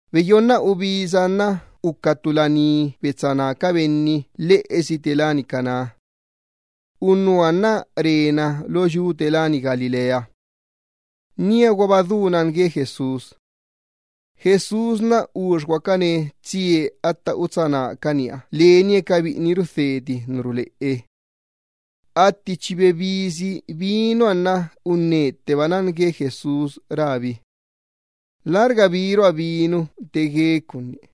Beyonna ubisa nna uca ttu laní betsá ná ca benni lheꞌesi lána Caná. Unnuha nna rena lo yu gue Galilea. Níaguaba du nan gue Jesús. Uxiguacana Jesús tsie atta utsá nácaniha lenie ca biꞌini rudheti ca tisa ruleꞌe. Atti chi bebisi vinuha nna unnetteba nan gue Jesús rábi: —Lärga birua vinu te gue ca unní.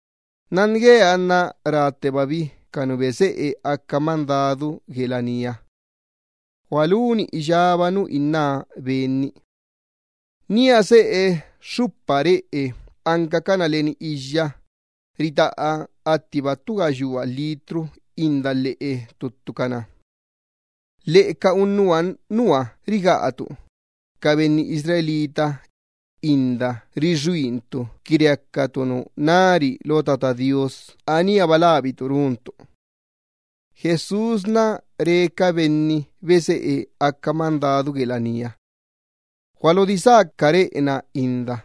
Nan gue Benniha nna ráttebabi ca nu beseꞌe aca mandadu gue laníha: —¡Gualuni iyába nu inná Ben-ni! Nía seꞌe xxupa reꞌe ancacana leni iyya, ritaꞌa attiba ttu gayua litro inda lheꞌe ttuttucana. Lheꞌe ca unnuha nua rigaꞌa ca benni Israel inda rixuuquinna qui reacacana nu nari lo Tata Do Iyyabaaha, aníaba labicana runcana. Jesús re ca benni beseꞌe aca mandadu gue laníha: —Gualodisá ca reꞌe-na inda.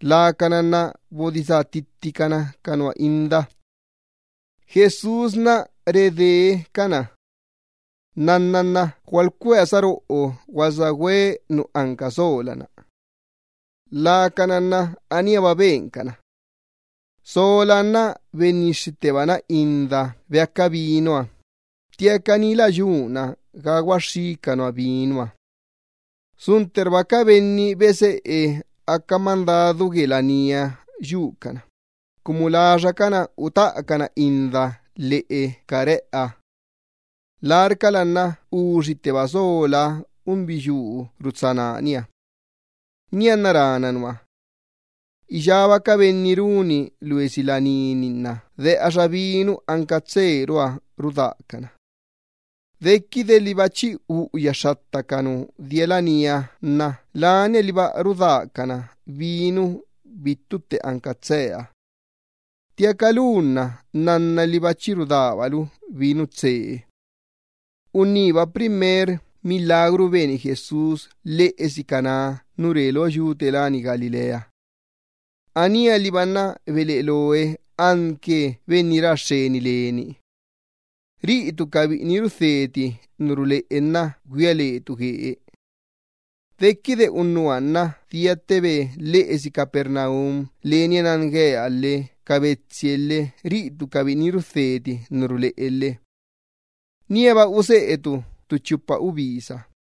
Lacana nna bodisá ttittican ca nua inda. Jesús redee cana: —Nnanna nna gualcuea saroꞌo gualsagüe nu anca sola-na. Lacana nna aníaba bencana. Solaha nna bennixxittebana inda beaca vinuha, ttiaca ni lä yuna ga guaxxí ca unnuha vinuha. Suntterba ca benni beseꞌe aca mandadu gue laníha yucana, cumu laxacana utaꞌacana inda lheꞌe ca reꞌeha. Larcala nna uxitteba solaha unbiyuu rutsá nániha. Nianna rána unnuha: —Iyába ca benni runi loesi laní-ni nna deꞌaxa vinu anca tseeruha rudácana. Dequide liba chi belin ca nu dia laníha uꞌuyacana vinu, lania liba rudácana vinu bittu tte anca tseeha. Ttiaca lu nna nnanna liba chi rudábalu vinu tsee. Unníba primer milagru beni Jesús lheꞌesi Caná nu re lo yu gue Galilea. Anía liba nna beleꞌe loe anque benni ra xxeni leni. Ca biꞌini rudheti ca tisa ruleꞌe nna güia lecabi guee. Dequide unnuha nna diattebe lheꞌesi Capernaum lenie nan gueha lhe ca betsie lhe ca biꞌini rudheti ca tisa ruleꞌe lhe. Níaba useꞌeque ttu chupa ubisa.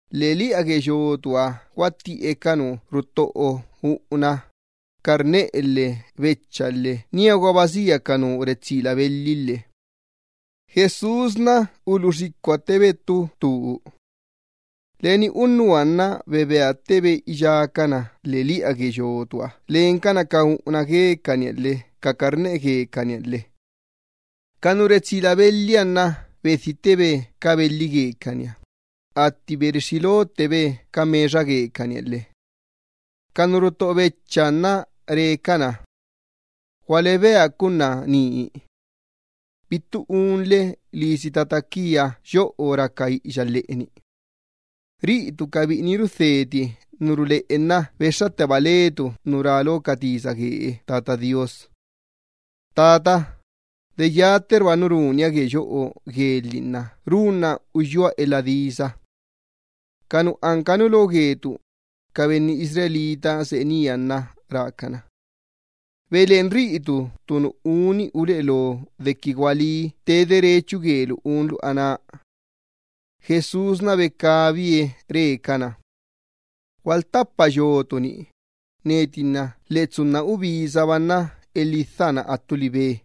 Lheꞌeliꞌa gue yotuha guattiꞌe ca nu ruttoꞌo uꞌuna lhe carneꞌe lhe becha lhe níaguaba sia ca nu retsila belhi lhe. Jesús uluꞌu xicuattebe ttu tuu. Leni unnuha nna bebeattebe iyába ca unnuha lheꞌeliꞌa gue yotuha lencana ca uꞌuna guecaniha lhe ca carneꞌe guecaniha lhe. Ca nu retsila belhiha nna bedhittebe ca belhi guecaniha, atti berixxi lottebe ca mexa guecaniha lhe. Ca nu ruttoꞌo bechaha nna re cana: —¡Gualebea ca unna ni! Bittu unle lisi tata quia yoꞌo raca iꞌiya lheꞌeni. Ca biꞌini rudheti ca tisa ruleꞌe Benniha nna bexxatteba lecabi nu rá lo ca tisa gue Tata Do Iyyabaaha: “Tata, de yatterba nu runia gue yoꞌo guelhi nna runna uyúa elha disa.” Ca nu anca nu lo gue ca benni Israel, seꞌe nía nna rácana: —Beleꞌen riꞌitu ttu nu uni uleꞌe lo dequi gualí te derechu guelu unlu aná. Jesús becabie re cana: —Gualuttapa yotu-ni, neti nna lheꞌe tsunna ubisaba nna elhidha na attu libe.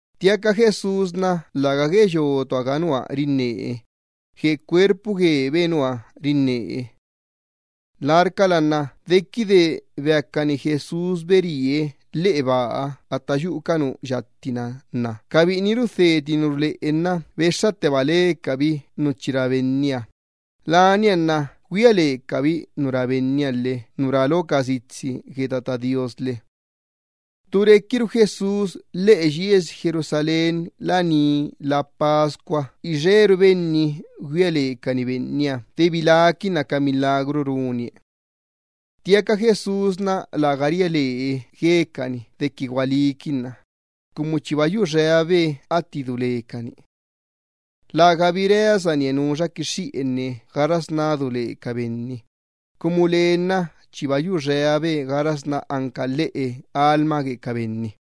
Ttiaca Jesús nna läga gue yotuha ga nua rinnee, gue cuerpu guebe Benniha rinnee. Larcala nna dequide beacani Jesús beríe lheꞌe baa atta yuꞌu ca nu yatti-na, ca biꞌini rudheti ca tisa ruleꞌe nna bexxatteba lecabi nu chi rá Benniha, lania nna güia lecabi nu rá Benniha lhe nu rá lo ca sitsi gue Tata Do Iyyabaaha lhe. Ttu requiru Jesús lheꞌe yiesi Jerusalén laní Pascua ixeru benni güia lecani Benniha de biláquinna ca milagru runie. Ttiaca Jesús läga ria lee guecani dequi gualíquinna cumu chiba yuxeabe atti du lecani. Lägabi reasanie nuxa quixxiꞌenne gaxasná du le ca benni, cumu lee nna chiba yuxeabe gaxasná anca lhiꞌu lheꞌe lastoo ca benni.